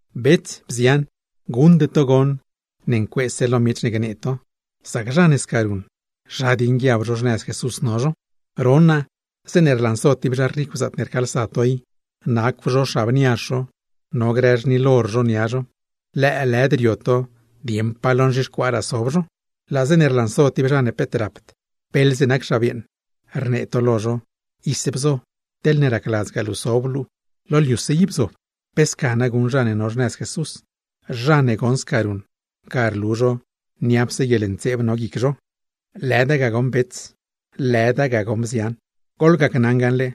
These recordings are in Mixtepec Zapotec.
Bets, bzian, guṉde to ne ncueese lo miech ne gnee to, sac zha ne sca ruṉ, zha dieṉ guiab zho xnëz Jesús no zho. Ron naa, zeeṉe rlanso tib zha ricw zaatne rcaalsa to i, nacw zho xab niazh zho, no grë xnil or zho nia zho, lëëlëd rio to dieṉ pa lo wenraa sob zho; laa zeeṉe rlanso tib zha mban beeḻze nac xab yeeṉ, rnee to lo zho: “Ise bzo, teḻne racladzgaa luu sob luu, lo liuse i bzob.” ¿Pe sca na rac zha ne no xnëz Jesús? Zha ne goṉ sca ruṉ, ga rlu zho niapse guieḻntseeb no guic zho. Lëda ga goṉ bets, lëda ga goṉ bzian. Goḻgacnaṉ gaṉle,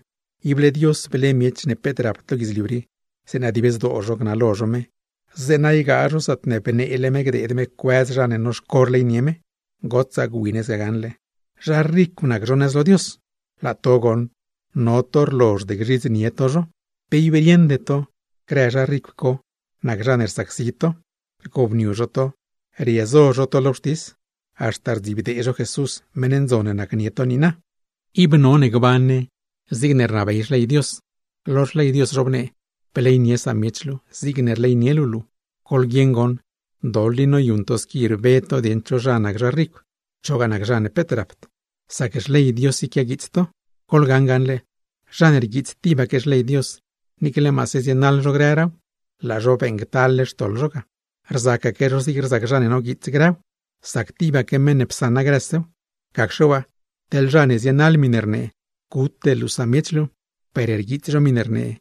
ible Dios ble miech ne peet rapd lo guidzliu rii, zeeṉa dib zdoo zho gnalo zho me, zeeṉa ygaa zho zaatne bneele me gdeed me cuëz zha ne noxco rleynie me. Gotsaa gwi ne sca gaṉle, zha ricw nac zho nëz lo Dios; laa to goṉ, no to rlozhd gzhidznie to zho. ¿Pe ib rieṉde to, grë zha ricw co nac zha ne rsacsi to? Rgobniu zho to, riezo zho to lo wxtis; haxta rdzibdee zho Jesús, meṉ ndzon ne nacnie to niina. Ib none gban ne zigne rnabey Xley Dios, lo xley me zhobnee: “Bleynie samiech luu, zigne rleynie luu luu.” Goḻguieṉ goṉ, doḻ i noyuṉ to squi rbe to dieṉ cho nac zha ricw, chogaa nac zha mban; sac Xley Dios i quiaguiits to. Goḻgacnaṉ gaṉle, zha ne rguiits tibaque xley Dios, niicle maase zienaḻ zho grëraaw, laa zho beeṉctal-le xtoḻ zho ga, rzacaque zho zig zha ne noguiits grëw. Sac tibaque meṉ ne psaṉa grësew. Gacxe waa, teḻ zha ne zienaḻ miṉe rnee: “Gute luu samiech luu”, per rguiits zho miṉe rnee: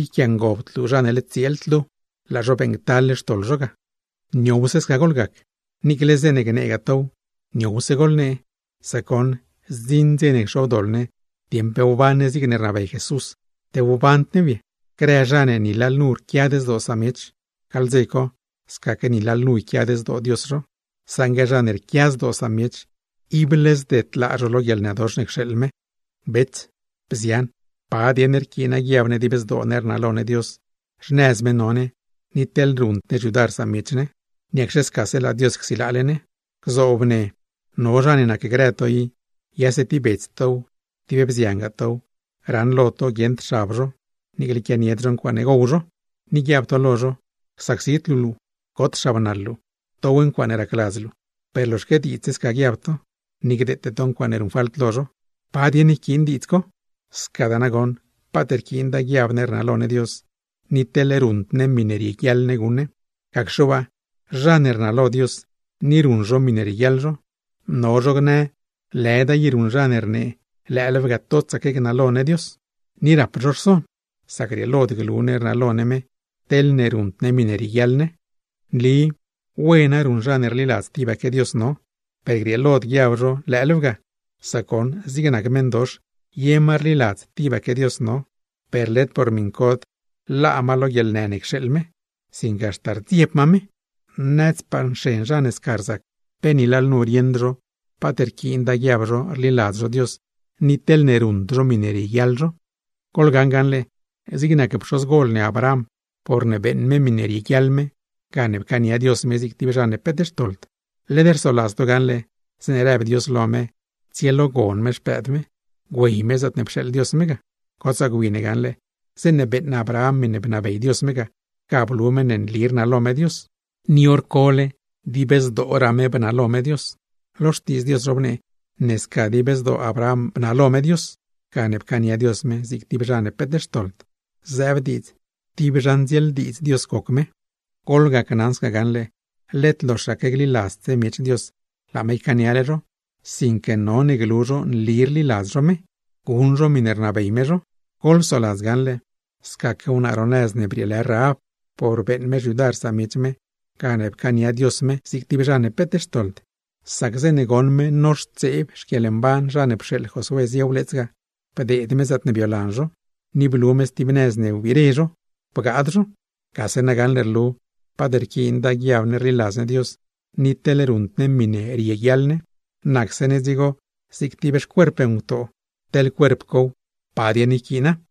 “Yquiangobd luu zha ne led tsieeld luu”, laa zho beeṉctal-le xtoḻ zho ga. Niowse sca goḻgac, niicle zeeṉe gneegaa tow, niowse goḻnee; sac goṉ, zdziṉ dze cxobdoḻ ne dieṉ pe wban ne zigne rnabey Jesús, te wband new ye. Grë zha ne ni lalnu rquiad zdoo samiech, gaḻ dze co scaque ni lalnu yquiad zdoo Dios zho; saṉgue zha ne rquia zdoo samiech, ible zdedlaa zho lo guieḻnëdox ne cxeeḻ me. Bets, bzian, ¿pa dieṉ rquiin guiab ne dib zdoo ne rnalo ne Dios, xnëz me no ne, ni teḻ ruṉd ne xyudar samiech ne? ¿Niacxe scase laa Dios csilaale ne? Gzoob ne no zha ne nacgrë to i, yase tib bets tow, tib bziangaa tow, raṉlo to guieṉd xab zho, niicle quianied zho ncuaaṉe gow zho; ni guiab to lo zho: “Csacsid luu luu, got xabnaḻ luu, dow ncuaaṉe racladz luu”, per loxaque diidz sca guiab to, ni gdeete to ncuaaṉe ruṉ falt lo zho. ¿Pa dieṉ yquiin diidz co? Scadaa nagoṉ paat rquiinda guiab ne rnalo ne Dios, ni teḻ ruṉd ne miṉe rieguiaḻ ne guṉ ne. Gacxe waa, zha ne rnalo Dios ni ruṉ zho miṉe rieguiaḻ zho, no zho gnë lëda i ruṉ zha ne rnee lëëlew ga totsaque gnalo ne Dios. Ni rap zho rson, sac grieelod glu ne rnalo ne me, teḻne ruṉd ne miṉe rieguiaḻ ne. Nli wena ruṉ zha ne rliladz tibaque Dios no, per grieelod guiab zho lëëlew ga, sac goṉ zig nac meṉdox ye ma rliladz tibaque Dios no, per led por miṉcod laa ma lo guieḻnë ne cxeeḻ me, sinque haxta rdzieb ma me. Nadzpaa nxen zha ne sca rzac, pe ni lalnu rieṉd zho paat rquiinda guiab zho rliladz zho Dios ni teḻne ruṉd zho miṉe rieguiaḻ zho. Goḻgaṉ gaṉle, zig nac pxozgol ne Abraham, porne beeṉ me miṉe rieguiaḻ me gane pcaania Dios me zig tib zha ne peet xtoḻ. Led rsoladz to gaṉle, zeeṉe rëb Dios lo me tsielogon me xpëëd me, güey me zaatne pxeeḻ Dios me. Gotsaa gwi ne gaṉle, zeeṉe beeṉ Abraham miṉe bnabey Dios me ga, ga blu ne nli rnalo me Dios, ni hor co mazdraa dib zdoo me bnalo me Dios. Lo Xtiidz Dios zhobnee ne scataa dib zdoo Abraham bnalo me Dios, gane pcaania Dios me zig tib zha ne peet xtoḻd; zëëb diidz, tib zha ndzieeldiidz Dios goc me. Goḻgacnaṉ sca gaṉle, led loxaque gliladzse miech Dios, laa me ycaaniale zho; sinque none glu zho nli rliladz zho me, guṉ zho miṉe rnabey me zho. Goḻsoladz gaṉle, scaque wnaa ro nëz ne brieelë Rahab, por beeṉ me xyudar samiech me, gane pcaania Dios me zig tib zha ne peet xtoḻd; sac zeeṉe goṉ me noxtseeb zha ne pxeeḻ Josué zie wleets ga, bdeed me zaatne biolan zho, ni blu me stib nëz ne wbire zho, bgaad zho. Gase na gaṉle rlu, paat rquiinda guiab ne rliladz ne Dios ni teḻ ruṉd ne miṉe rieguiaḻ ne, nacse ne dzigo zig tib xcuerp ngutoo, teḻ cuerp cow, ¿pa dieṉ yquiina?